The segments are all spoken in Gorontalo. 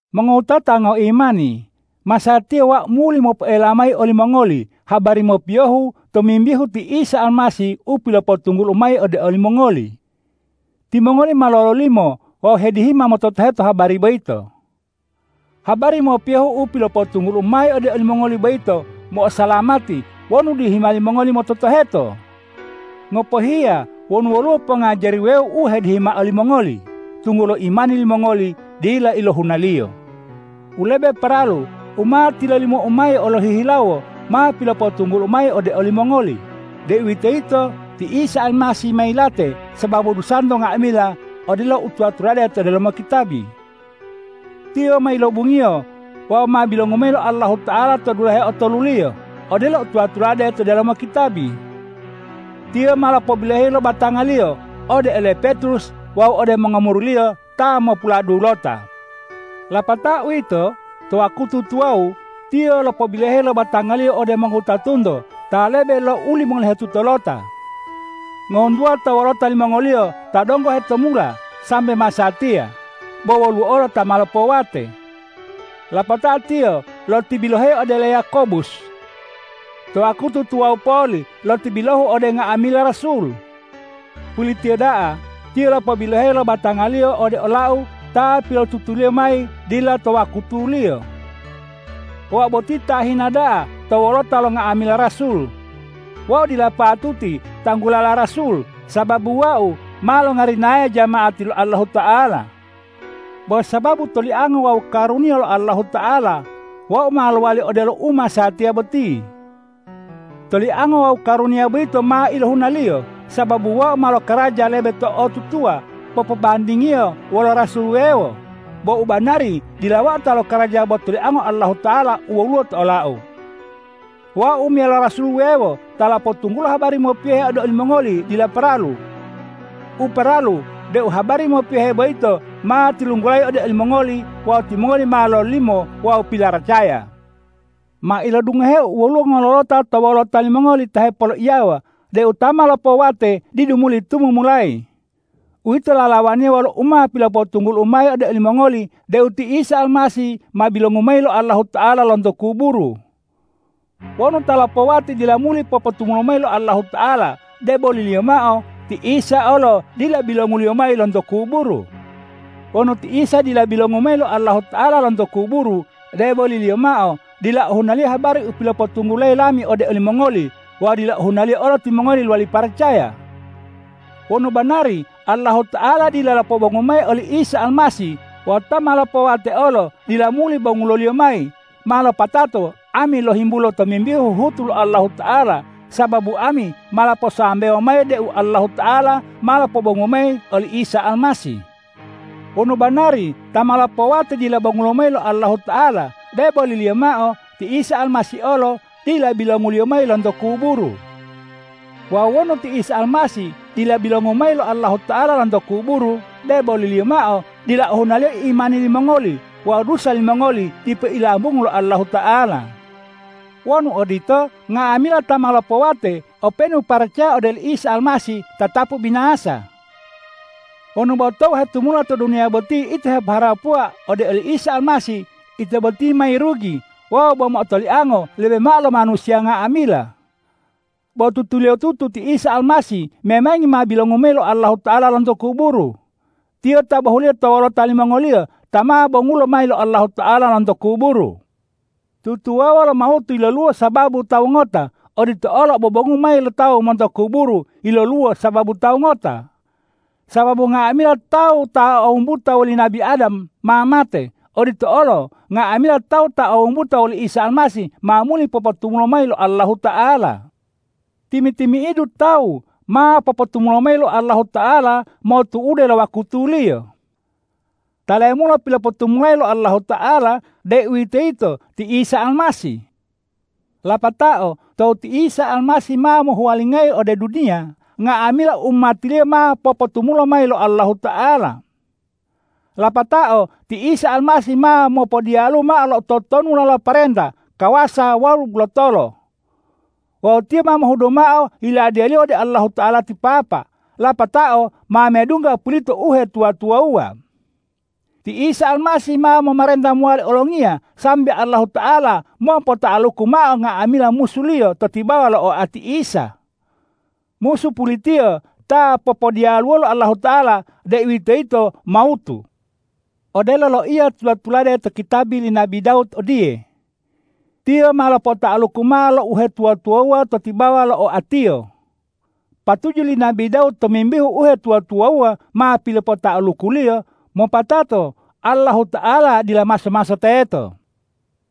Mongowutata ngoimani, masatiya wau muli mopoela mayi olimongoli habari mopiyohu tomimbihu ti Isa Almasih u pilopotunggulu'u mayi ode olimongoli. Timongoli ma lololimo wawu hedihima mototoheto habari boyito. Habari mopiyohu u pilopotunggulu'u mayi ode olimongoli boyito, mo'osalamati wonu dihima limongoli mototoheto, ngopohiya wonu woluwo pongajari wuwewo u hedihima olimongoli, tunggulo imani limongoli dila ilohunaliyo. U lebe paralu u ma tilolimou mayi lohihilawo ma pilopotunggulu'u mayi ode olimongoli, deuwitoyito ti Isa Almasih ma yilate sababu dusanto nga'amila odelo u tula-tulade to delomo kitabi. Tiyo ma yilobungiyo wawu ma bilongu mayi lo Allahuta'ala to dulahe otoluliyo, odelo u tula-tulade to delomo kitabi. Tiyo ma lopobiloheyi lo batanga-Liyo ode ole Petrus wawu ode mongomuri-Liyo ta mopuladulota. Lapatao uwito, to wakutu tuwawu Tiyo lopobiloheyi lo batanga-Liyo ode mongowutatunto ta lebe lo ulimolohetutolota. Ngohuntuwa to wolota limongoliyo ta donggo hetumula sambe masatiya, bo woluwo olo ta ma lopowate. Lapatao Tiyo lotibilohu ode ole Yakobus. To wakutu tuwawu poli lotibilohu ode nga'amila rasul. Pulitiyo da'a Tiyo lopobiloheyi lo batanga-Liyo ode olau ta pilotutuliyo mayi dila to wakutuliyo. Wau boti ta hina da'a to wolota lo nga'amila rasul. Wau dila patuti tanggulala rasul, sababu wau ma longarinaya jama'ati lo Allahuta'ala. Bo sababu toliango wawu karuniya lo Allahuta'ala, wau ma lowali odelo u masatiya boti. Toliango wawu karuniya boyito ma ilohunaliyo, sababu wau ma lokaraja lebe to'otutuwa popobandingiyo wolo rasul wuwewo, bo u banari dila wau ta lokaraja bo toliango Allahuta'ala u woluwo to olau. Wau meyalo rasul wuwewo ta lopotunggulo habari mopiyohu ode olimongoli dila paralu. U paralu deu habari mopiyohe boyito ma tilunggulayi ode olimongoli wawu timongoli ma lololimo wawu pilaracaya. Ma ilodungoheu woluwo ngololota to wolota limongoli ta hepoloiyawa deu ta ma lopowate didu muli tumumulayi. Uwito lalawaniya wolo u ma pilopotunggulayi lami ode olimongoli deu ti Isa Almasih ma bilongu mayi lo Allahuta'ala lonto kuburu. Wonu ta ma lopowate dila muli popotumulo mayi lo Allahuta'ala, deboliliyo mao ti Isa olo dila bilongu-Liyo mayi lonto kuburu. Wonu ti Isa dila bilongu mayi lo Allahuta'ala lonto kuburu, deboliliyo mao dila ohunaliyo habari u pilopotunggulayi lami ode olimongoli wawu dila ohunaliyo olo timongoli lowali paracaya. Wonu banari Allahuta'ala dila lopobongu mayi oli Isa Almasih wawu ta ma lopowate olo dila muli bongulo-Liyo mayi, ma lopatato ami lohimbulo tomimbihu huhutu lo Allahuta'ala, sababu ami ma loposambewo mayi deu Allahuta'ala ma lopobongu mayi oli Isa Almasih. Wonu banari ta ma lopowate dila bongulo mayi lo Allahuta'ala, deboliliyo mao ti Isa Almasih olo dila bilongu-Liyo mayi lonto kuburu. Wawu wonu ti Isa Almasih dila bilongu mayi lo Allahuta'ala lonto kuburu, deboliliyo mao dila ohunaliyo imani limongoli wawu dusa limongoli dipo ilambungu lo Allahuta'ala. Wonu odito, nga'amila ta ma lopowate openu paracaya ode oli Almasih tatapu binasa. Wonu bo tou hetumula to duniya boti ito hepoharapuwa ode oli Isa Almasih, ito boti ma yirugi wawu bo mo'otoliango lebe mao lo manusiya nga'amila. Bo tutuliyotutu ti Isa Almasih memangi ma bilongu mayi lo Allahuta'ala lonto kuburu. Tiyo ta bohuliyo to wolota limongoliyo ta ma bongulo mayi lo Allahuta'ala lonto kuburu. Tutuwawuwa wolo mawutu yiloluwo sababu tawu ngota; odito olo obobongu mayi lo tawu monto kuburu yiloluwo sababu Tawu ngota. Sababu nga'amila tawu ta o wumbuta woli nabi Adam ma mate; odito olo nga'amila tawu ta o wumbuta woli Isa Almasih ma muli popotumulo mayi lo Allahuta'ala. Timi-timi'idu tawu ma popotumulo mayi lo Allahuta'ala motu'ude lo wakutuliyo. Ta lemulo pilopotumulayi lo Allahuta'ala, deuwitoyito ti Isa Almasih. Lapatao tou ti Isa Almasih ma mohuwalingayi ode duniya, nga'amila umati-Liyo ma popotumulo mayi lo Allahuta'ala. Lapatao ti Isa Almasih ma mopodiyalu mao lo totonulala pomarenta, kawasa wawu lotolo. Wawu Tiyo ma mohudu mao Yiladiya-Liyo ode Allahuta'ala ti Papa, lapatao ma medungga pulito uhetuwa-tuwawuwa. Ti Isa Almasih ma momarenta mowali olongiya sambe Allahuta'ala mopota'aluku mao nga'amila musu-Liyo to tibawa lo oati Isa. Musu pulitiyo ta popodiyaluwo lo Allahuta'ala, deuwitoyito mawutu. Odelo loiya tula-tulade to kitabi li nabi Dawud odiye,”Tiyo ma lopota'aluku mao lo uhetuwa-tuwawuwa to tibawa lo oa-Tiyo.” Patuju li nabi Dawud tomimbihu uhetuwa-tuwawuwa ma pilopota'aluku-Liyo mopatato Allahuta'ala dila maso-maso teto.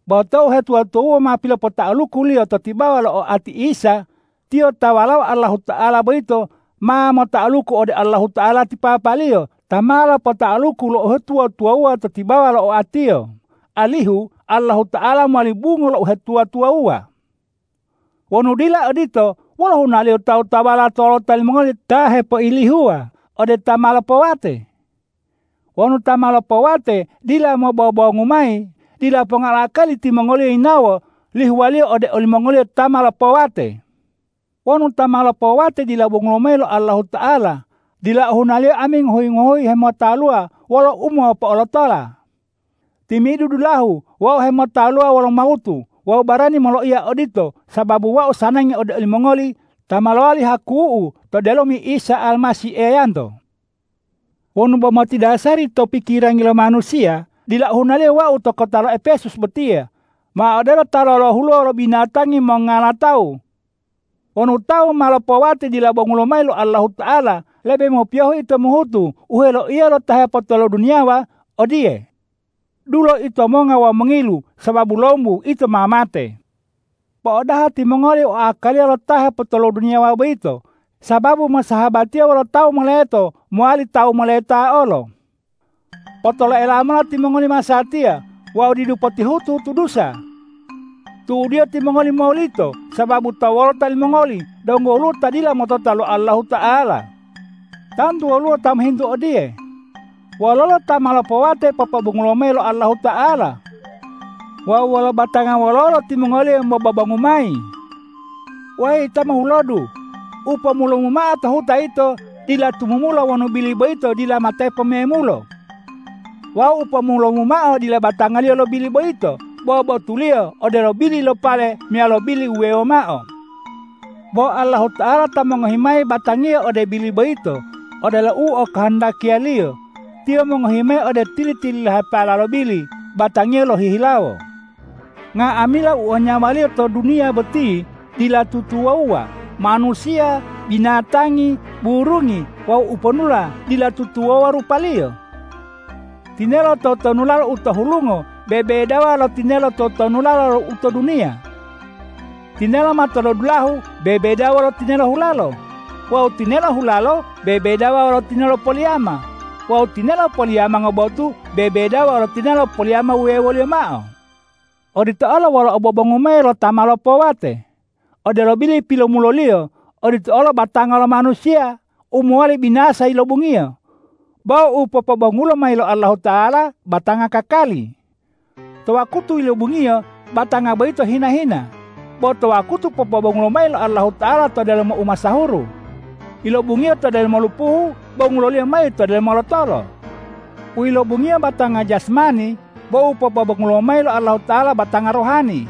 Bo tou uhetuwa-tuwawuwa ma pilopota'aluku-Liyo to tibawa lo oati Isa, Tiyo ta Walao Allahuta'ala boyito ma mota'aluku ode Allahuta'ala ti Papa-Liyo ta ma lopota'aluku lo uhetuwa-tuwawuwa to tibawa lo oa-Tiyo, alihu Allahuta'ala mowali bungo lo uhetuwa-tuwawuwa. Wonu dila odito, wolo hunaliyo tawu-tawuwala to wolota limongoli ta hepoilihuwa ode ta ma lopowate? Wonu ta ma lopowate dila mobobongu mayi, dila ponga lo akali timongoliyo yinawo lihuwaliyo ode olimongoliyo ta ma lopowate. Wonu ta ma lopowate dila bongulo mayi lo Allahuta'ala, dila ohunaliyo ami ngohuyi-ngohuyi hemotaluwa wolo umo'otopotala. Timi'idu dulahu wau hemolotaluwa wolo mawutu. Wau barani moloiya odito sababu wau sanangi ode olimongoli ta ma lowali haku'u to delomi Isa Almasih Eyanto. Wonu bo motidasari to pikirangi lo manusiya, dila ohunaliyo wau to kota lo Epesus botiya ma odelo ta lolohuluwa wolo binatangi mongala tawu. Wonu tawu ta ma lopowate dila bongulo mayi lo Allahuta'ala, lebe mopiyohu ito mohutu u heloiya lo ta hepotoloduniyawa odiye,”Dulo ito monga wawu mongilu, sababu lombu ito ma mate.” Po'odaha timongoli oakaliya lo ta hepotoloduniyawa boyito, sababu mosahabatiya wolo tawu moleto mowali tawu moleta olo. Potoloela lomola timongoli masatiya wawu didu potihutu-hutu dusa! Tu'udiyo timongoli molito, sababu to wolota limongoli donggo woluwo ta dila motota lo Allahuta'ala. Tantu woluwo ta mohintu odiye,”Wololo ta ma lopowate popobongulo mayi lo Allahuta'ala? Wawu wolo batanga wololo timongoliyo mobobongu mayi?” Weyi ta mohulodu! U pomulomu mao to huta yito dila tumumulo wonu bili boyito dila matepo memulo. Wawu u pomulomu mao dila batangiyo lo bili boyito, bo botuliyo odelo bili lo pale meyalo bili wuwewo mao. Bo Allahuta'ala ta mongohi mayi batangiyo ode bili boyito odelo u okohondakiya-Liyo, Tiyo mongohi mao ode tili-tililahepala lo bili batangiyo lohihilawo. Nga'amila u o nyawaliyo to duniya boti dila tutuwawuwa. Manusiya, binatangi, burungi wawu uponula dila tutuwawuwa rupaliyo. Tinelo totonulala u to hulungo bebedawa lo tinelo totonulala u to duniya. Tinelo matolodulahu bebedawa lo tinelo hulalo. Wawu tinelo hulalo bebedawa lo tinelo poliyama. Wawu tinelo poliyama ngobotu bebedawa lo tinelo poliyama wuwewoliyo mao. Odito olo wolo obobongu mayi lo ta ma lopowate. Odelo bili pilomuloliyo, odito olo batanga lo manusiya u mowali binasa yilobungiyo, bo u popobongulo mayi lo Allahuta'ala batanga kakali. To wakutu yilobungiyo batanga boyito hina-hina, bo to wakutu popobongulo mayi lo Allahuta'ala to delomo umasahuru. Yilobungiyo to delomo lupuhu, bongulo-Liyo mayi to delomo lotolo. U yilobungiyo batanga jasmani, bo u popobongulo mayi lo Allahuta'ala batanga rohani.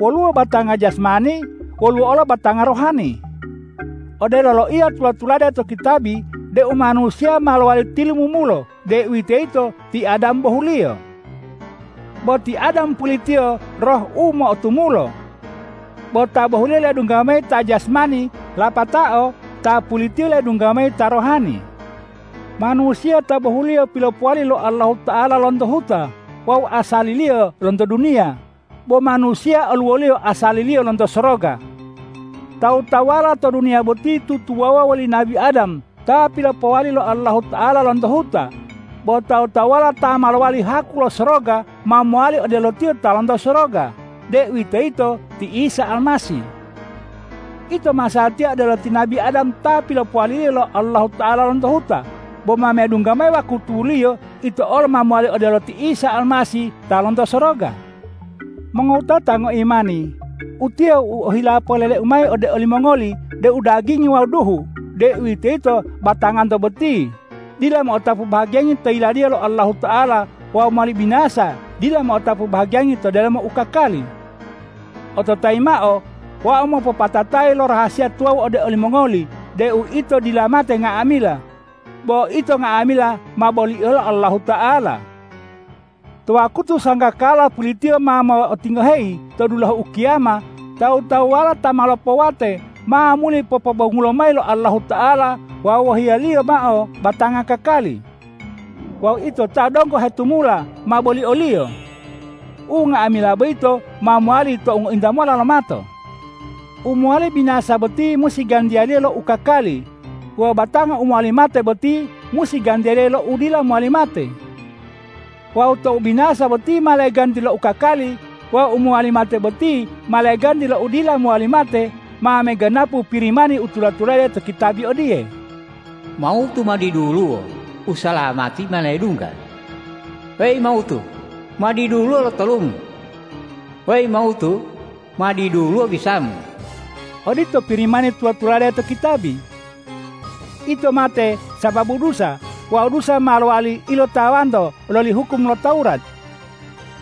Woluwo batanga jasmani; woluwo olo batanga rohani. Odelo loiya tula-tulade to kitabi deu manusiya ma lowali tilumumulo, deuwitoyito ti Adam bohuliyo. Bo ti Adam pulitiyo Roh u mo'otumulo. Bo ta bohuliyo ledungga mayi ta jasmani, lapatao Ta pulitiyo ledungga mayi ta rohani. Manusiya ta bohuliyo pilopowali lo Allahuta'ala lonto huta wawu asaliliyo lonto duniya, bo Manusiya oluwoliyo asaliliyo lonto soroga. Tawu-tawuwala to duniya boti tutuwawuwa woli nabi Adam ta pilopowali lo Allahuta'ala lonto huta, bo tawu-tawuwala ta ma lowali haku lo soroga, ma mowali odelo Tiyo ta lonto soroga, deuwitoyito ti Isa Almasih. Ito masatiya odelo ti nabi Adam ta pilopowali lo Allahuta'ala lonto huta. Bo ma medungga mayi wakutuliyo ito olo ma mowali odelo ti Isa Almasih ta lonto soroga. Mongowutata ngoimani, utiye u ohila poleleu mayi ode olimongoli deu dagingi wawu duhu, deuwitoyito batanganto boti, dila mo'otapu bahagiyangi to Yiladiya lo Allahuta'ala wawu u mowali binasa dila mo'otapu bahagiyangi to delomo u kakali. Ototayi mao: Wau mopopatatayi lo rahasiya tuwawu ode olimongoli deu ito dila mate nga'amila, bo ito nga'amila ma bolio lo Allahuta'ala. To wakutu sanggakala pulitiyo ma mo'otingoheyi to dulahu ukiyama, tawu-tawuwala ta ma lopowate ma muli popobongulo mayi lo Allahuta'ala wawu wohiya-Liyo mao batanga kakali. Wawu ito ta donggo hetumula ma bolio-Liyo. Unga'amila boyito ma mowali tou ngointa mola lomato. U mowali binasa boti musi gantiyala lo u kakali wawu batanga u mowali mate boti musi gantiyala lo u dila mowali mate. Wawu tou u binasa boti ma leganti lo u kakali wawu u mowali mate boti ma leganti lo u dila mowali mate, ma meganapu Pirimani u tula-tulade to kitabi odiye,”Mawutu ma diduluwo; usalamati ma ledungga. Weyi mawutu, ma diduluwo lotolumu! Weyi mawutu, ma diduluwo bisamu!” Odito Pirimani tula-tulade to kitabi. Ito mate sababu dusa wawu dusa ma lowali ilotawanto loli hukum lo Tawurat.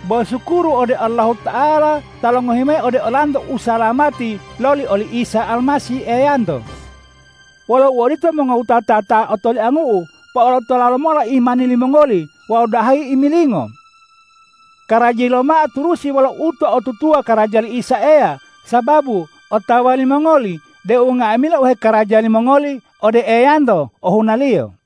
Bo sukuru ode Allahuta'ala ta longohi mayi ode olanto usalamati loli oli Isa Almasih Eyanto! Wolo uodito mongowutata ta otoliangu'u, po'olotola lomola imani limongoli wawu dahayi imilingo. Karajayi lomola turusi wolo uto'otutuwa karaja li Isa Eya, sababu otawa limongoli deu nga'amila u hekaraja limongoli ode Eyanto ohunaliyo.